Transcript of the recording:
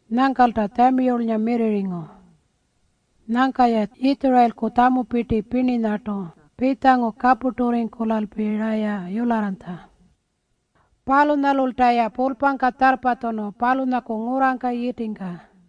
Nyangkalta Tjamiyulnga mirrirringu. Nyangka-ya Yitjurayilku tjamupirti pirninyartu pitjangu kapurturringkulalpi-raya yularranytja. Palunyalulta-ya pulpangka tjarrpatjunu palunyaku ngurrangka yitingka.